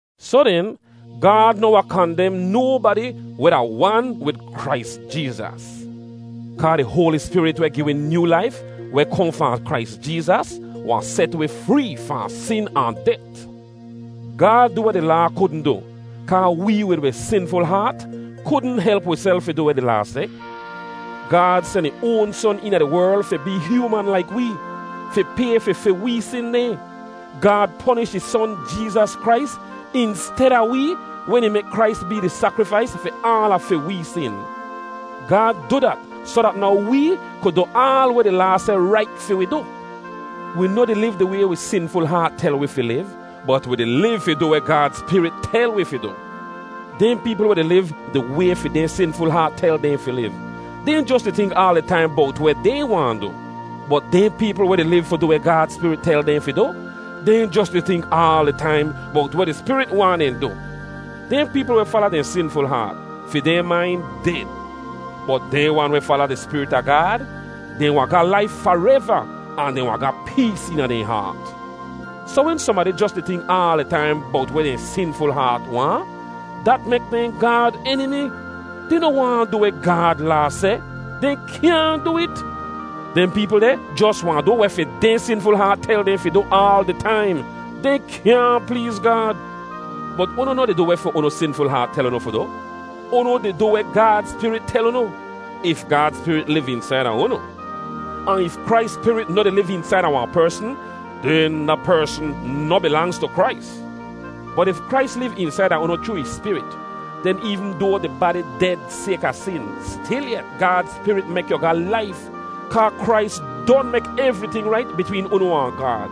Soh den, Gaad noh wahn kandem nobadi weh da wan wid Krais Jeezas. Kaa di Hoali Spirit weh gi wi nyoo laif, weh kohn fahn Krais Jeezas, wahn set wi free fahn sin ahn det. Gaad du weh di Laa kudn du, kaa wee wid wi sinful haat kudn help wiself fi du weh di Laa seh. Gaad sen ih oan Son eena di werl fi bee hyooman laik wee, fi pay fi fi wee sin dehn. Gaad ponish ih Son Jeezas Krais insteda wee wen ih mek Krais bee di sakrifais fi aala fi wee sin. Gaad du dat soh dat now wee ku du aal weh di Laa seh rait fi wi du. Wi noh di liv di way wi sinful haat tel wi fi liv, bot wi di liv fi du weh Gaad Spirit tel wi fi du. Dehn peepl weh di liv di way fi dehn sinful haat tel dehn fi liv, dehn jos di tink aal di taim bowt weh dehn waahn du. Bot dehn peepl weh di liv fi du weh Gaad Spirit tel dehn fi du, dehn jos di tink aal di taim bowt weh di Spirit waahn dehn du. Dehn peepl weh fala dehn sinful haat, fi dehn main ded. Bot dehn wan weh fala di Spirit a Gaad, dehn wahn ga laif fareva, ahn dehn wahn ga pees eena dehn haat. Soh wen sohnbadi jos di tink aal di taim bowt weh dehn sinful haat waahn, dat mek dehn Gaad enimi. Dehn noh waahn du weh Gaad Laa seh; dehn kyaahn du it. Dehn peepl deh jos wahn du weh fi dehn sinful haat tel dehn fi du aal di taim; dehn kyaahn pleez Gaad. Bot unu noh di du weh fi unu sinful haat tel unu fi du; unu di du weh Gaad Spirit tel unu, if Gaad Spirit liv eensaida unu. Ahn if Krais Spirit noh di liv eensaida wahn persn, den da persn noh bilangz tu Krais. Bot if Krais liv eensaida unu chroo ih Spirit, den eevn doa di badi ded sayka sin, stilyet Gaad Spirit mek yu ga laif, kaa Krais don mek evriting rait bitween unu ahn Gaad.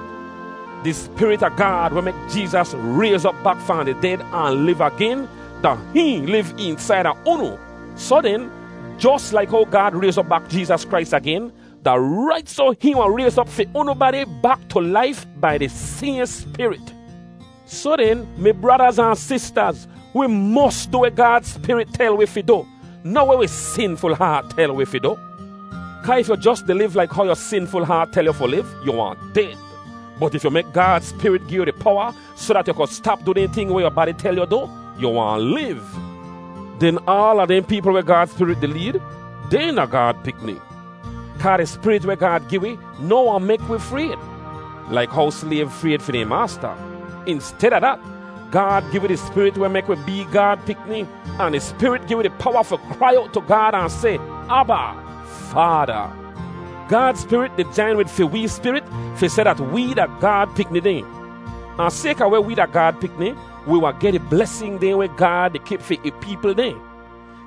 Di Spirit a Gaad weh mek Jeezas rayz op bak fahn di ded ahn liv agen, da hihn liv eensaida unu. Soh den, jos laik how Gaad rayz op bak Jeezas Krais agen, da rait soh hihn wahn rayz op fi unu badi bak tu laif bai di sayhn Spirit. Soh den, mi bradaz ahn sistaz, wi mos du weh Gaad Spirit tel wi fi du, noh weh wi sinful haat tel wi fi du. Kaa if yu jos di liv laik how yu sinful haat tel yu fi liv, yu wahn ded. Bot if yu mek Gaad Spirit gi yu di powa soh dat yu ku stap du dehn ting weh yu badi tel yu du, yu wahn liv. Den aala dehn peepl weh Gaad Spirit di leed, dehn da Gaad pikni. Kaa di spirit weh Gaad gi wi noh wahn mek wi frayd, laik how slayv frayd fi dehn maasta. Insteda dat, Gaad gi wi di Spirit weh mek wi bee Gaad pikni, ahn di Spirit gi wi di powa fi krai owt tu Gaad ahn seh, “Aba, Faada.” Gaad Spirit di jain wid fi wee spirit fi seh dat wee da Gaad pikni dehn. Ahn sayka weh wee da Gaad pikni, wi wahn geh di blesin dehn weh Gaad di kip fi ih peepl dehn.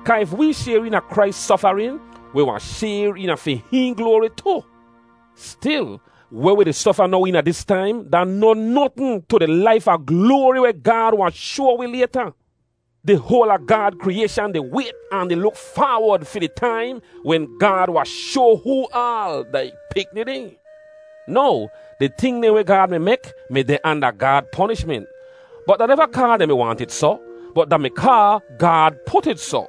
Kaa if wee shayr eena Krais sofarin, wi wahn shayr eena fi hihn gloari tu. Stil, weh wi di sofa now eena dis taim da noh notn tu di laif a gloari weh Gaad wahn shoa wi layta. Di hoal a Gaad kriyayshan di wayt ahn di luk faawod fi di taim wen Gaad wahn shoa hoo aal da ih pikni dehn. Now, di ting dehn weh Gaad mi mek mi deh anda Gaad ponishment, bot da neva kaa dehn mi waahnt it soh, bot da-mi kaa Gaad put it soh.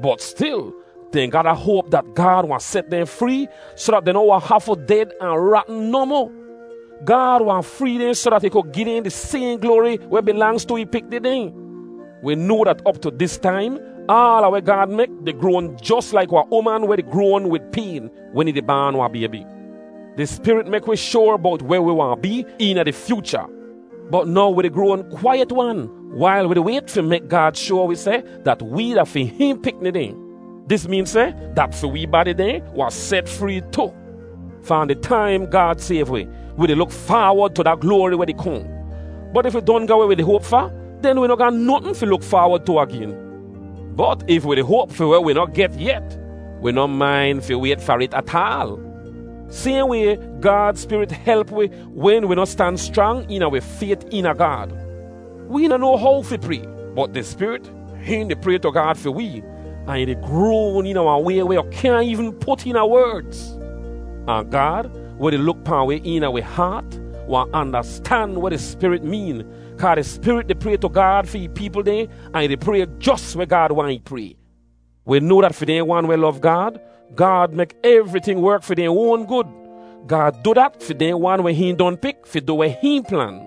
Bot stil, dehn ga da hoap dat Gaad wahn set dehn free soh dat dehn noh wahn hafu ded ahn ratn nohmoh. Gaad wahn free dehn soh dat ih ku gi dehn di sayhn gloari weh bilangz tu ih pikni dehn. Wi noa dat op tu dis taim, aala weh Gaad mek di groan jos laik wahn uman weh di groan wid payn wen ih di baan wahn baybi. Di Spirit mek wi shoar bowt weh wi wahn bee eena di fyoocha. Bot now wi di groan kwaiyet-wan wail wi di wayt fi mek Gaad shoa wi seh dat wee da fi hihn pikni dehn. Dis meen seh dat fi wee badi dehn wahn set free tu. Fahn di taim Gaad sayv wi, wi di luk faawod tu da gloari weh di kohn. Bot if wi don ga weh wi di hoap fa, den wi noh ga notn fi luk faawod tu agen. Bot if wi di hoap fi weh wi noh get yet, wi noh main fi wayt far it ataal. Sayhn way, Gaad Spirit help wi wen wi noh stan schrang eena wi fayt eena Gaad. Wee noh noa how fi pray, bot di Spirit, hihn di pray tu Gaad fi wee, ahn ih di groan eena wahn way weh yu kyaahn eevn put eena werdz. Ahn Gaad, weh di luk pahn wi eena wi haat, wahn andastan weh di Spirit meen, kaa di Spirit di pray tu Gaad fi ih peepl dehn ahn ih di pray jos weh Gaad waahn ih pray. Wi noa dat fi dehn wan weh lov Gaad, Gaad mek evriting werk fi dehn oan gud. Gaad du dat fi dehn wan weh hihn don pik fi du weh hihn plan.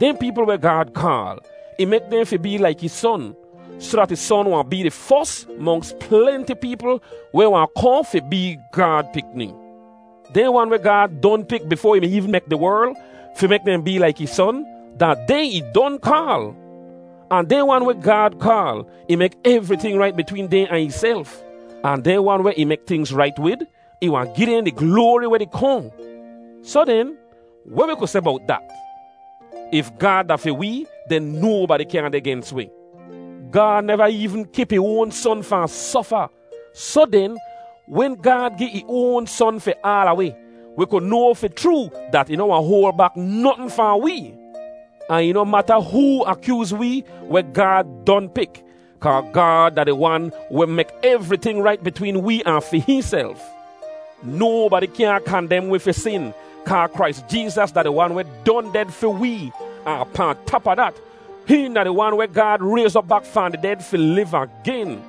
Dehn peepl weh Gaad kaal, ih mek dehn fi bee laik ih Son, soh dat ih Son wahn bee di fos monks plenti peepl weh wahn kohn fi bee Gaad pikni. Dehn wan weh Gaad don pik bifoa ih mi eevn mek di werl, fi mek dehn bee laik ih Son, da dehn ih don kaal. Ahn dehn wan weh Gaad kaal, ih mek evriting rait bitween dehn ahn ihself. Ahn dehn wan weh ih mek tingz rait wid, ih wahn gi dehn di gloari weh di kohn. Soh den, weh wi ku seh bowt dat? If Gaad da fi wee, den nobadi kyaahn deh gens wi. Gaad neva eevn kip ih oan Son fahn sofa, soh den wen Gaad gi ih oan Son fi aala wi, wi ku noa fi chroo dat ih noh wahn hoal bak notn fahn wee. Ahn ih noh mata hoo akyooz wee weh Gaad don pik, kaa Gaad da di wan weh mek evriting rait bitween wee ahn fi hihnself. Nobadi kyaahn kandem wi fi sin, kaa Krais Jeezas da di Wan weh don ded fi wee, ahn pahn tap a dat, hihn da di Wan weh Gaad rayz op bak fahn di ded fi liv agen.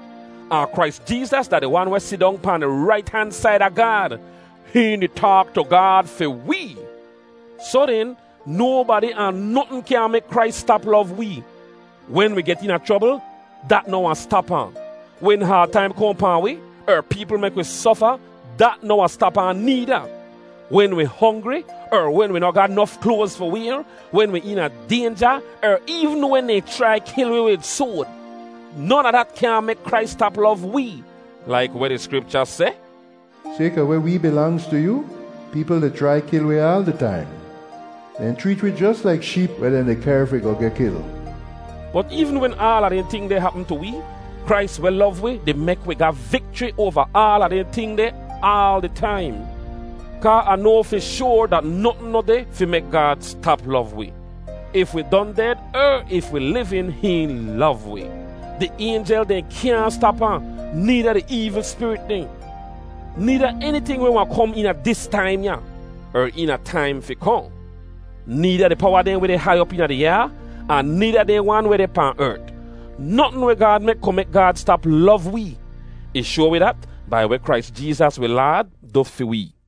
Ahn Krais Jeezas da di Wan weh sidong pan di rait han said a Gaad. Hihn di taak tu Gaad fi wee. Soh den, nobadi ahn notn kyaahn mek Krais stap lov wee. Wen wi get eena chrobl, dat noh wahn stap ahn. Wen haad taim kohn pahn wi, er peepl mek wi sofa, dat noh wahn stap ahn needa. Wen wi hongri, er wen wi noh ga nof kloaz fi wayr, wen wi eena daynja, er eevn wen dehn chrai kil wi wid soad, non a dat kyaahn mek Krais stap lov wee. Laik weh di Skripcha seh, “Sayka weh wee bilangz tu yoo, peepl di chrai kil wi aal di taim. Dehn chreet wi jos laik sheep weh dehn di kehr fi goh geh kil.” Bot eevn wen aala dehn ting deh hapm tu wee, Krais weh lov wi di mek wi ga vikchri oava aala dehn ting deh aal di taim. Kaa Ah noa fi shoar dat notn noh deh fi mek Gaad stap lov wi. If wi don ded er if wi livin, hihn lov wi. Di aynjel dehn kyaahn stap ahn, needa di eevl spirit dehn, needa eniting weh wahn kom eena dis taim ya, er eena taim fi kohn. Needa di powa dehn weh deh hai op eena di ayaa, ahn needa dehn wan weh deh pahn ert. Notn weh Gaad mek ku mek Gaad stap lov wee. Ih shoa wi dat bai weh Krais Jeezas wi Laad du fi wee.